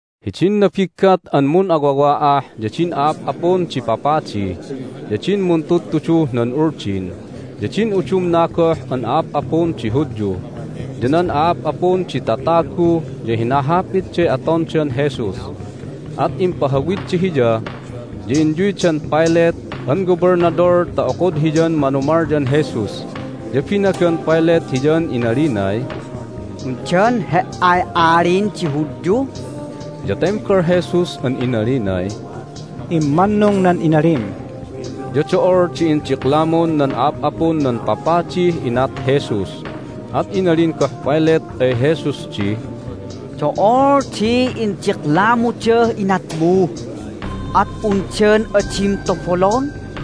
Hidin nabiggat an mun'awawa'ah ya din a'ap'apun di papadi, ya din muntudtuduh nan Uldin, ya din udumna goh an a'ap'apun di Hudyu, ya nan a'ap'apun di tatagu ya hinahapitday atondan Jesus. At impahawidda Hiya, ya inyuydan Pilate an gobelnadol ta okod hiyan manumalyan Jesus. Ya binagan Pilate Hiyan inalinay, "Undan He"ay Alin di Hudyu?" Ya tembal Jesus an inalinay, "Immannung nan inalim." Ya do'ol di indiklamun nan a'ap'apun nan papadih inat Jesus, at inalin goh Pilate ay Jesus di, "Do'ol di indiklamudah inatmu! At undan adim tobolon?"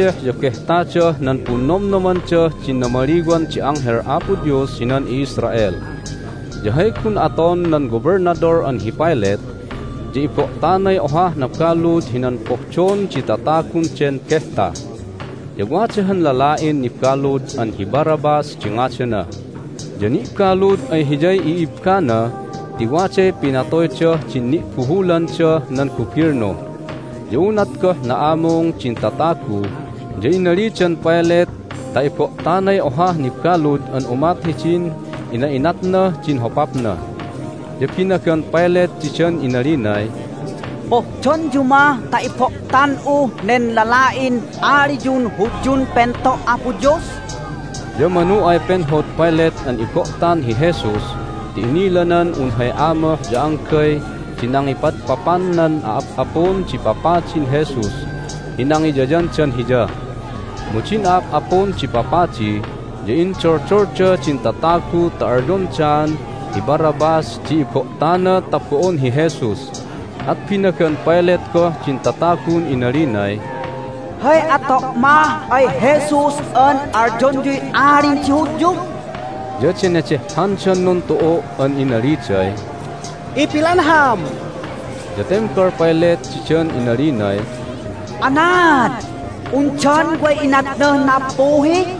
Nipaddeh ya Behtadah nan Punnomnomandah din Namaliwan di Anghel Apo Dios hinan i'Israel, ya hay gun aton nan Gobelnadol an hi Pilate ya ibo'tanay ohah nabalud hinan pohdon di tatagun den behta. Ya wada han lala'in nibalud an hi Barabbas di ngadana, ya ni'balud ay hiyay i'ibbana ti waday pinatoydah din ni'buhulandah nan gubilnu. Ya unat goh na'amung din tatagu ya inalidan Pilate ta ibo'tanay ohah nibalud an umat hidin ina'inatnah din hopapna. Ya binagan Pilate didan inalinay, "Pohdonyu mah ta ibo'tan'uh nen lala'in aliyun Hudyun Pento' Apo Dios?" Ya manu ay penhod Pilate an ibo'tan hi Jesus ti inilanan un hay amoh ya anggay di nangipadpapan nan a'ap'apun di papadin Jesus hi nangiyayandan hiya. Mu din a'ap'apun di papadi ya indoldolda din tatagu ta alyondaan hi Barabbas di ibo'tana ta bo'on hi Jesus! At binagan Pilate goh din tatagun inalinay, "Hay ato' mah ay Jesus an alyonyuy alin di Hudyu?" Ya denedehhandan nuntu'u' an inaliday, "Ipilanham!" Ya tembal Pilate didan inalinay, "Anaad? Undan way inatnah nappuhi?"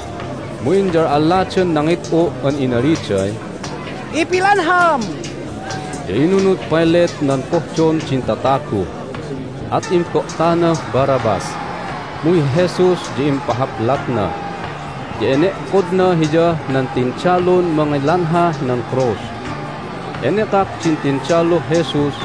Mu inyal'alladan nangit'u' an inaliday, "Ipilanham!" Ya inunud Pilate nan pohdon din tatagu, at imbo'tanah Barabbas. Mu hi Jesus di impahaplatna, ya ene'kodna Hiyah nan tindalun mangilanhah nan krus. Hay Nunlayalayahan nan Tindalun Jesus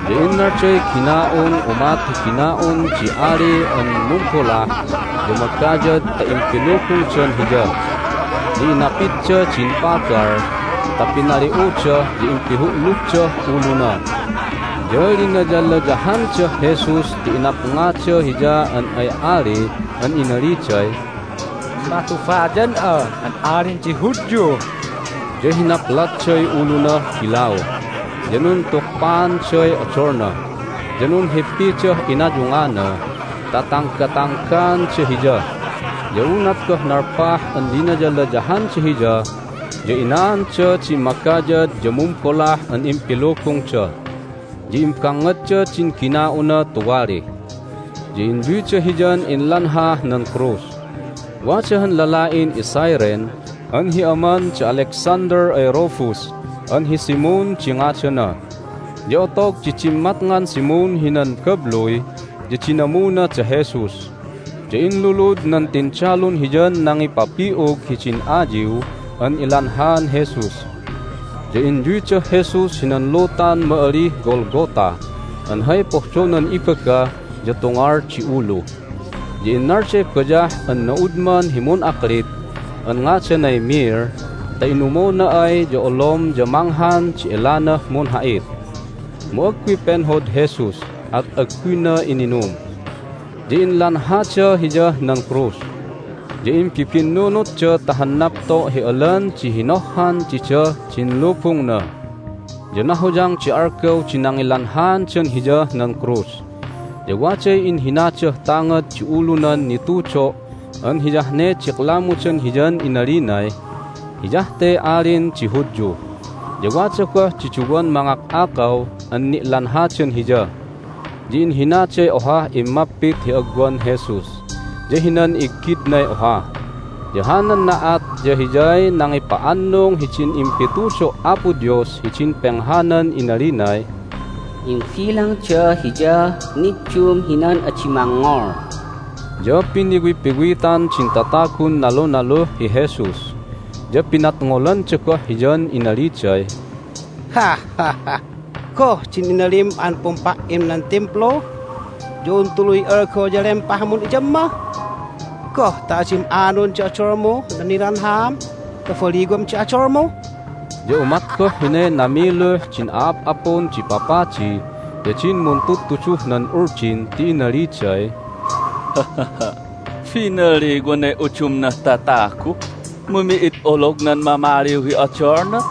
Ya innalday gina'un umat hi gina'un di ali an mumbolah ya magayad ta impilubungdan Hiya, ya inapidda din pagal ta pinali'uda ya impihu'lubdah uluna. Ya linayalayahandah Jesus ti inapngada Hiya an ay ali an inaliday, "Matubayan'a an Alin di Hudyu!" Ya hinaplatday ulunah bilau, ya nuntukpaanday odolna, ya nunhippidah inayungana ta tanggatanggaanda Hiya. Ya unat goh nalpah an linayalayahanda Hiya ya inaanda din magayad ya mumbolah an impilubungda, ya imbangngadda din gina'una tuwali. Ya inyuyda Hiyan inlanhah nan krus. Hay Nilanhaan Jesus hinan Krus Wada han lala'in iCyrene an hi aman da Alexander ay Rufus an hi Simon di ngadana. Ya otog di dimmatngan Simon hinan babluy ya dinamuna da Jesus, ya inlulud nan tindalun hiyan nangipapi'ug hidin ayiw an ilanhaan Jesus. Ya inyuydah Jesus hinan lutan ma'alih Golgotha an hay pohdonan ibaga ya Tungal di Ulu. Ya innalday bayah an na'udman hi mun'aklit an ngadanay myrrh ta inumona ay ya olom ya manghan di elanah munha'it, mu agguy penhod Jesus, at agguyna ininum. Ya inlanhada Hiyah nan krus. Ya imbibinnunutda ta han napto' hi alan di hinohhan didah din lubungna. Ya nahoyang di algaw di nangilanhaandan Hiyah nan krus. Ya waday inhinadah tangad di ulunan nitudo' an hiyah ne diklamudan Hiyan inalinay, "Hiyah te alin di Hudyu." Ya wada goh di duwan mangak'akaw an ni'lanhadan Hiya, ya inhinaday ohah immapit hi agwan Jesus, ya hinan iggidnay oha. Ya hanan na'at ya hiyay nangipa'annung hidin impitudo' Apo Dios hidin penghanan inalinay, "Imbilangda Hiyah niddum hinan adi mangngol." Ya piniwipiwitan din tatagun nalunaluh hi Jesus, ya pinadngolanda goh Hiyan inaliday, "Goh din inalim an pumpa"im nan Timplu ya un tuluy algaw ya lempahmun iyamma? Goh ta adim anon di odolmuh nan nilanhaam ta baliwam di odolmu?" Ya umat goh hinay namiluh din a'ap'apun di papadi ya din muntudtuduh nan Uldin ti inaliday, "Binaliwanay udumnah tatagu, mu mi'id olognan mamaliw hi odolna!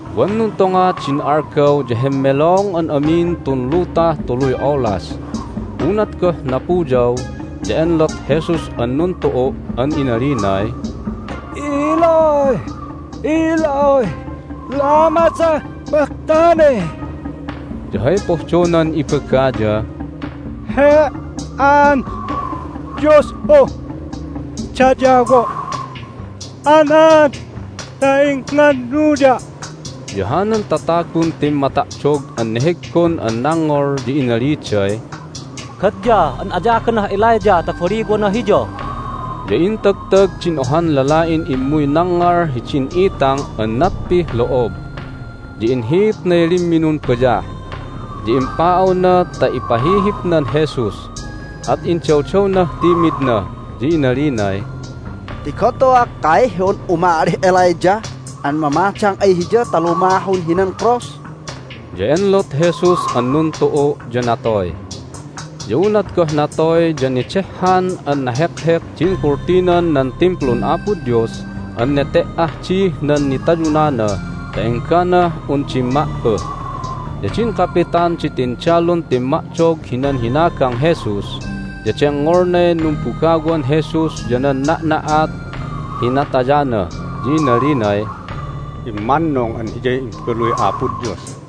Wan nuntonga din algaw ya hemmelong an amin tun lutah tuluy olas. Unat goh napuyaw ya enlot Jesus an nuntu'u' an inalinay, "Eloi, Eloi, lama sabachthani?" ya hay pohdonan ibaga ya, "He"an Dios'un dayawo', anaad ta ingnganuya'?" Ya hanan tatagun timmata'dog an neheggon an nangngol ya inaliday, "Gadya an ayaganah Elijah ta baliwana Hiya!" Ya intagtag din ohan lala'in immuy nangngal hidin itang an natpih lo'ob, ya inhiitnay limminun bayah, ya impa'awna ta ipahihipnan Jesus, at indawdawnah timidna, ya inalinay, "Tigon tu'u akkay hi un umalih Elijah an mamadang ay Hiya ta lumahun hinan krus!" Ya enlot Jesus an nuntu'u', ya natoy. Ya unat goh natoy ya nedehhan an nahekhek din kultinan nan Timplun Apo Dios an nete"ah dih nan nitayunana ta enggah un dimma'puh. Ya din kapitan di tindalun timma'dog hinan hinagang Jesus ya dengngolnay numbugawan Jesus ya nan na'na'at hi natayana, ya inalinay, "Immannung an Hiyay Imbaluy Apo Dios!"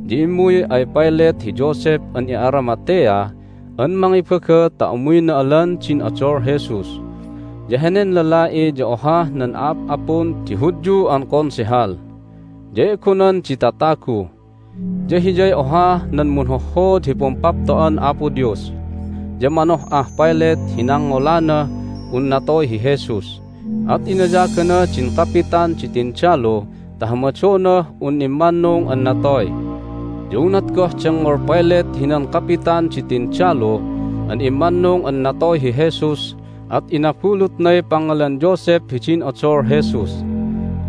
ya immuy ay Pilate hi Joseph an i'Aramathea an mangibaga ta umuyna alan din odol Jesus. (Ya henen lala'i ya ohah nan a'ap'apun di Hudyu an Konsehal, ya e'gonan di tatagu. Ya hiyay ohah nan munhohhood hi Pumpapto'an Apo Dios.) Ya manoh'ah Pilate hi nangngolanah un natoy hi Jesus, at inayagana din kapitan di tindalu ta hamadonah un immannung an natoy. Ya unat goh dengngol Pilate hinan kapitan di tindalu an immannung an natoy hi Jesus at inabulutnay pangngalan Joseph hidin odol Jesus.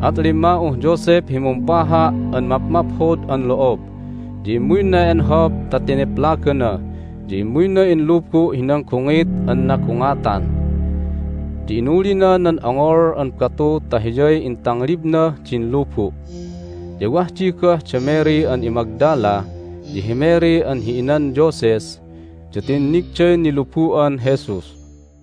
At limma'uh Joseph hi mumpaha' an mapmaphod an lo'ob, ya immuyna enhop ta teneplagana, ya immuyna inlubu' hinan gungit an nagungatan. Ya inulina nan ongol an batu ta hiyay intanglibnah din lubu'. Ya wah di goh da Mary an iMagdala ya hi Mary an hi inan Joses, ya tinnigday nilubu'an Jesus.